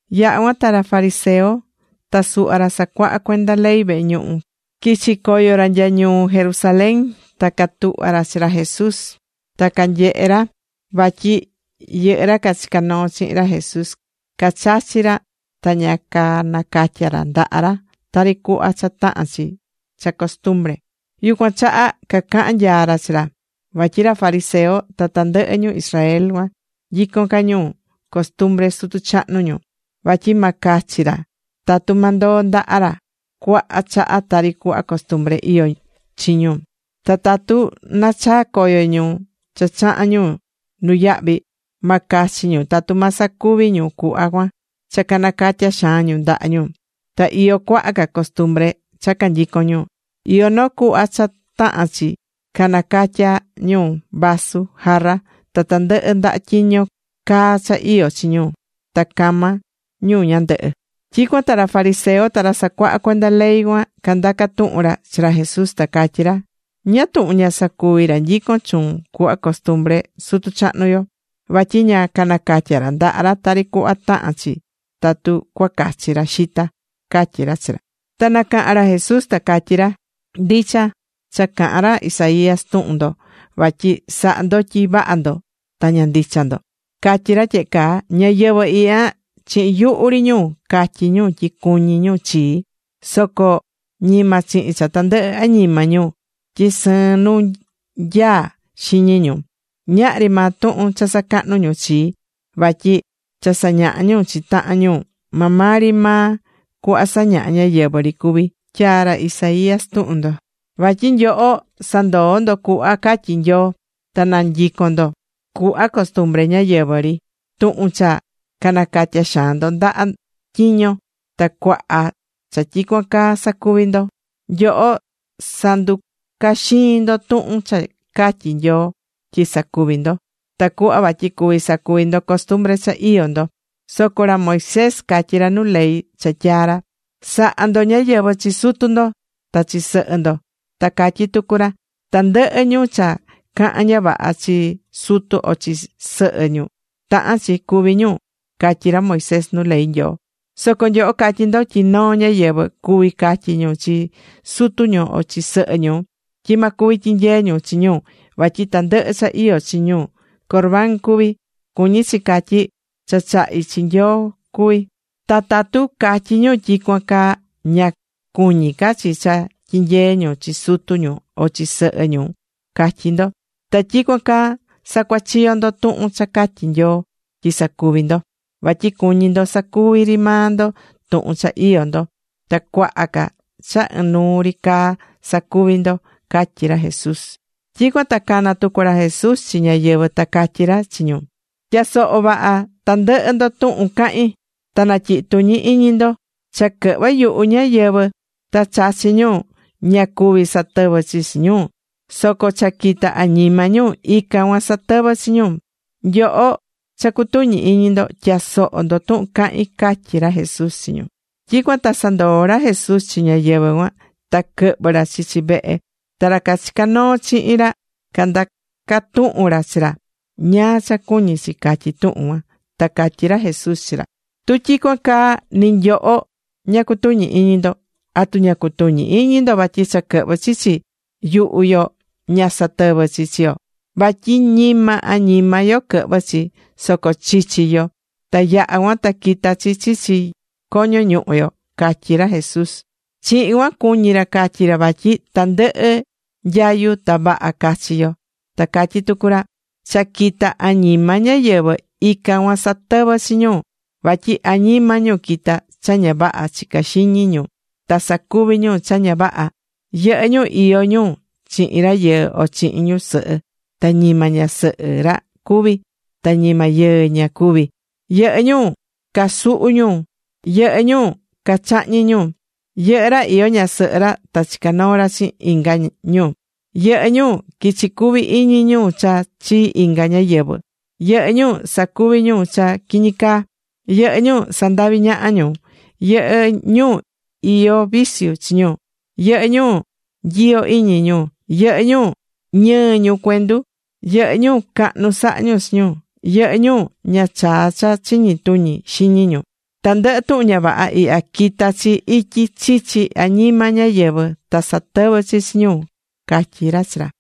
Yaha̱ cuan ta ra fariseo ta suhva ra sacuahá cuenda ley vehe ñuhu quichi̱ coyo ra nya ñuu Jerusalén, ta catuhva̱ ra chi ra Jesús. Ta canyehe̱ ra vatyi yɨhɨ́ ra cachicá noo chihin ra Jesús cachachí ra ta ña nacatya̱ ra ndaha ra tari cuhva cha tahán chi cha costumbre. Yucuan chaha cacaha̱n nyaa ra chi ra. Vatyi ra fariseo ta tandɨhɨ ñu Israel cuan nyicón ca ñu costumbre sutu chahnu ñu, vatyi ma cachi ra tatu ma ndoo ndaha ra cuaha chaha tari cuhva costumbre iyó chi ñu. Ta tatu nachaa coyo ñu cha chahan ñu nuyahvi, ma cachi ñu tatu ma sacuvi ñu cuhva cuan cha canacatya xaan ñu ndaha ñu. Ta iyó cuaha ca costumbre cha canyicón ñu. Iyó noo cuhva cha tahán chi nacatya ñu vasu, jarra, ta tandɨhɨ ndaha tyiño caa cha iyó chi ñu ta cama ñu ñandɨhɨ. Tyicuan ta ra fariseo ta ra sacuahá cuenda ley cuan candaca tuhun ra chi ra Jesús, ta catyí ra: ―¿Ñáá tuhun ña sacuví ra nyicón chuun cuhva costumbre sutu chahnu yo? Vatyi ña nacatyá ra ndaha ra tari cuhva tahán chi tatu cuacachi ra xita ―catyí ra chi ra. Ta nacaha̱n ra Jesús, ta catyí ra: ―Ndicha cha caha̱n ra Isaías tuhun ndo vatyi sahá ndo tyi vaha ndo ta ña ndicha ndo. Catyi̱ ra tyehe caa: Ñáyɨvɨ ihya, chihin yuhu ri ñu catyí ñu tyi cuñí ñu chii. Soco ñima chihin cha tandɨhɨ añima ñu, tyi sɨɨn nu nyaá xiñi ñu. Ñahri maa tuhun cha sacahnú ñu chii, vatyi cha sañahá ñu chi tahan ñu, maa maa ri maa cuhva sañahá ñáyɨvɨ ri cuví, tyaa̱ ra Isaías tuhun ndo. Vatyi nyoho sandoó ndo cuhva catyí Nyoo, ta nanyicón ndo cuhva costumbre ñáyɨvɨ ri, tuhun cha nacatya xaan ndo ndaha tyiño ndo, ta cuaha cha tyicuan caa sacuví ndo. Nyoho sanducaxii̱n ndo tuhun cha catyí Nyoo tyi sacuvi ndo, tacuhva vatyi cuvi sacuvi ndo costumbre cha iyó ndo. Soco ra Moisés catyí ra nu ley cha tyaa̱ ra: “Sa̱ha ndo ñáyɨvɨ chi sutu ndo ta chi sɨhɨ ndo.” Ta catyí tucu ra: “Tandɨhɨ ñu cha cahán ña vaha chi sutu o chi sɨhɨ ñu, tahán chi cúvi ñu.” catyí ra Moisés nu ley Nyoo. Soco nyoho catyí ndo tyi noo ñáyɨvɨ cuví catyí ñu chi sutu ñu o chi sɨhɨ ñu tyi ma cuvi tyinyee ñu chi ñu vatyi tandɨhɨ cha iyó chi ñu Corbán cuví. (Cuñí chi catyí: “Cha chahi̱ chi Nyoo cuví.”) Ta tatu catyí ñu tyicuan caa, ña cuñí ca chi cha tyinyee ñu chi sutu ñu o chi sɨhɨ ñu catyí ndo. Ta tyicuan caa sacuachiyó ndo tuhun cha catyí Nyoo tyi sacuvi ndo, vatyi cuñí ndo sacuvi ri maa ndo tuhun cha iyó ndo. Ta cuaha ca cha ɨnuu ri caa sacuví ndo ―catyí ra Jesús. Tyicuan ta cana̱ tucu ra Jesús chi ñáyɨvɨ ta catyí ra chi ñu: ―Tya̱soho vaha tandɨhɨ ndo tuhun cahín, ta natyihi tuñi iñi ndo. Cha quɨhvɨ́ yuhu ñáyɨvɨ ta chachí ñu, ña cuví satɨvɨ chi chi ñu. Soco cha quitá añima ñu, ican cuan satɨvɨ́ chi ñu. Nyoho cha cutuñí iñi ndo, tya̱soho ndo tuhun cahín ―catyí ra Jesús chi ñu. Tyicuan ta sandoo̱ ra Jesús chi ñáyɨvɨ cuan, ta quɨhvɨ̱ ra chichi vehe. Ta ra cachicá noo chihin ra candaca̱ tuhun ra chi ra ñáá cha cuñí chi catyi tuhun cuan. Ta catyí ra Jesús chi ra: ―Tu tyicuan caa, ni nyoho, ña cutuñí iñi ndo. ¿Atu ña cutuñí iñi ndo vatyi cha quɨhvɨ́ chichi yuhu yo ña satɨvɨ́ chi chi yo? Vatyi ñima añima yo quɨhvɨ́ chi, soco chichi yo. Ta yaha cuan ta quita chi chichi coño ñuhu yo ―catyí ra Jesús. Chihin cuan cuñí ra catyi ra vatyi tandɨhɨ nyayu ta vaha cachi yo. Ta catyí tucu ra: ―Cha quitá añima ñáyɨvɨ, ican cuan satɨvɨ́ chi ñu. Vatyi añima ñu quitá cha ña vaha chicá xiñi ñu, ta sacuví ñu cha ña vaha. Yɨhɨ́ ñu iyó ñu chihin rayɨɨ o chihin ñusɨhɨ ta ñima ñasɨhɨ ra cuví, ta ñima yɨɨ ñu cuví. Yɨhɨ́ ñu casuhú ñu. Yɨhɨ́ ñu cachahñí ñu. Yɨhɨ́ ra iyó ñasɨhɨ ra ta chicá noo ra chihin inga ñu. Yɨhɨ́ ñu quichi cuvi iñi ñu cha chii inga ñáyɨvɨ. Yɨhɨ́ ñu sacuví ñu cha quiñi caa. Yɨhɨ́ ñu sandaví ñaha ñu. Yɨhɨ́ ñu iyó viciu chi ñu. Yɨhɨ́ ñu nyiyo iñi ñu. Yɨhɨ́ ñu ñɨɨ ñu cuendu. Yɨhɨ́ ñu cahnu sahá ñu chi ñu. Yɨhɨ́ ñu ña chaa cha chiñi tuñi xiñi ñu. Tandɨhɨ tuhun ña vaha ihya, quitá chi ityi chichi añima ñáyɨvɨ, ta satɨvɨ́ chi chi ñu ―catyí ra chi ra.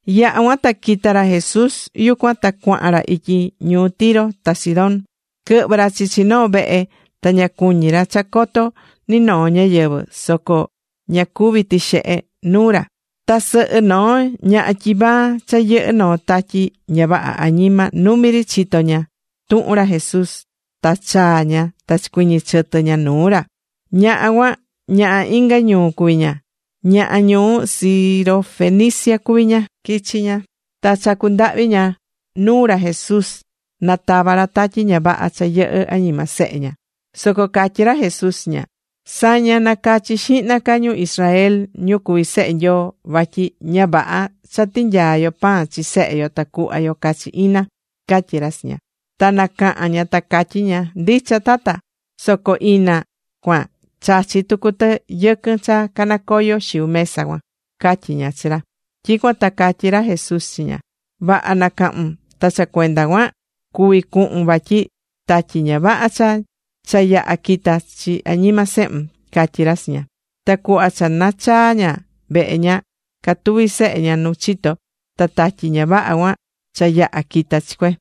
Yaha̱ cuan ta quita̱ ra Jesús yucuan, ta cuahan ra ityi ñuu Tiro ta Sidón. Quɨhvɨ̱ ra chichi noo vehe ta ña cuñí ra cha coto ni noo ñáyɨvɨ, soco ña cuví tixehe nuu ra. Ta sɨhɨ noo ñaha tyivaa cha yɨhɨ́ noo tatyi ña vaha añima, numi ri chito̱ ña tuhun ra Jesús. Ta chaa ña ta chicuiñi̱ chɨtɨ ña nuu ra. Ñaha cuan, ñaha inga ñuu cuví ña, ñaha ñuu Sirofenicia cuví ña. Quichi̱ ña ta chacú ndahvi ña nuu ra Jesús na tava ra tatyi ña vaha cha yɨhɨ́ añima sehe ña. Soco catyí ra Jesús chi ña: ―Sa̱ña, na̱cachi xihna ca ñu Israel ñu cuví sehe Nyoo, vatyi ña vaha cha tinyaá yo pan chi sehe yo ta cuhva yo cachi ina ―catyí ra Jesús chi ña. Ta nacaha̱n ña ta catyí ña: ―Ndicha, Tata, soco ina cuan chachí tucu tɨ yɨquɨn cha canacoyo xiu mesa cuan ―catyí ña chi ra. Tyicuan ta catyí ra Jesús chi ña: ―Vaha nacahu̱n. Ta cha cuenda cuan cuví cuhun, vatyi tatyi ña vaha cha yaha̱ quita̱ chi añima sehun ―catyí ra chi ña. Ta cuhva cha nachaa̱ ña vehe ña, catuví sehe ña nu chito, ta tatyi ña vaha cuan cha yaha̱ quita̱ chi cue.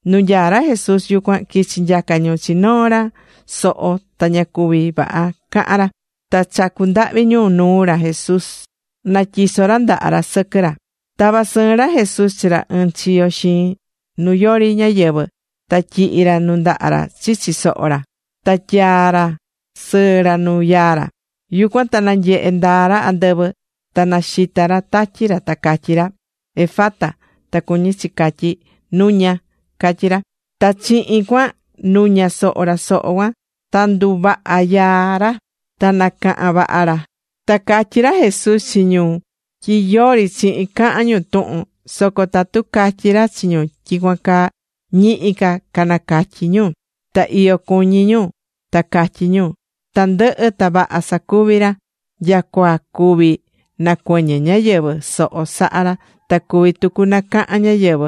Nu nyaá ra Jesús yucuan, quichi̱ nyaca ñu chi noo ra soho ta ña cuví vaha cahán ra. Ta chacu̱ ndahvi ñu nuu ra Jesús na tyiso ra ndaha ra sɨquɨ ra. Tava̱ sɨɨn ra Jesús chi ra ɨɨn chiyo xiin, nu yori ñáyɨvɨ, ta tyihi̱ ra nundaha ra chichi soho ra, ta tyaa̱ sɨɨ ra nu yaa ra. Yucuan ta nanyehe̱ ndaa ra andɨvɨ. Ta naxita̱ ra tatyi ra, ta catyí ra: ―¡Efata! ―ta cuñí chi catyí: ¡Nu̱ña! ―catyí ra. Ta chihin cuan nuña̱ soho ra soho cuan, ta nduvaha̱ yaa ra, ta nacaha̱n vaha ra. Ta catyi̱ ra Jesús chi ñu tyi yori chihin cahan ñu tuhun, soco tatu catyí ra chi ñu tyicuan caa, ñihi ca canacatyi ñu. Ta iyo cuñí ñu ta catyí ñu: ―Tandɨhɨ ta vaha sacuví ra. Nyacua cuvi nacuɨñɨ ñáyɨvɨ soho sahá ra ta cuví tucu nacahan ñáyɨvɨ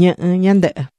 ñɨhɨ̱ ñandɨhɨ.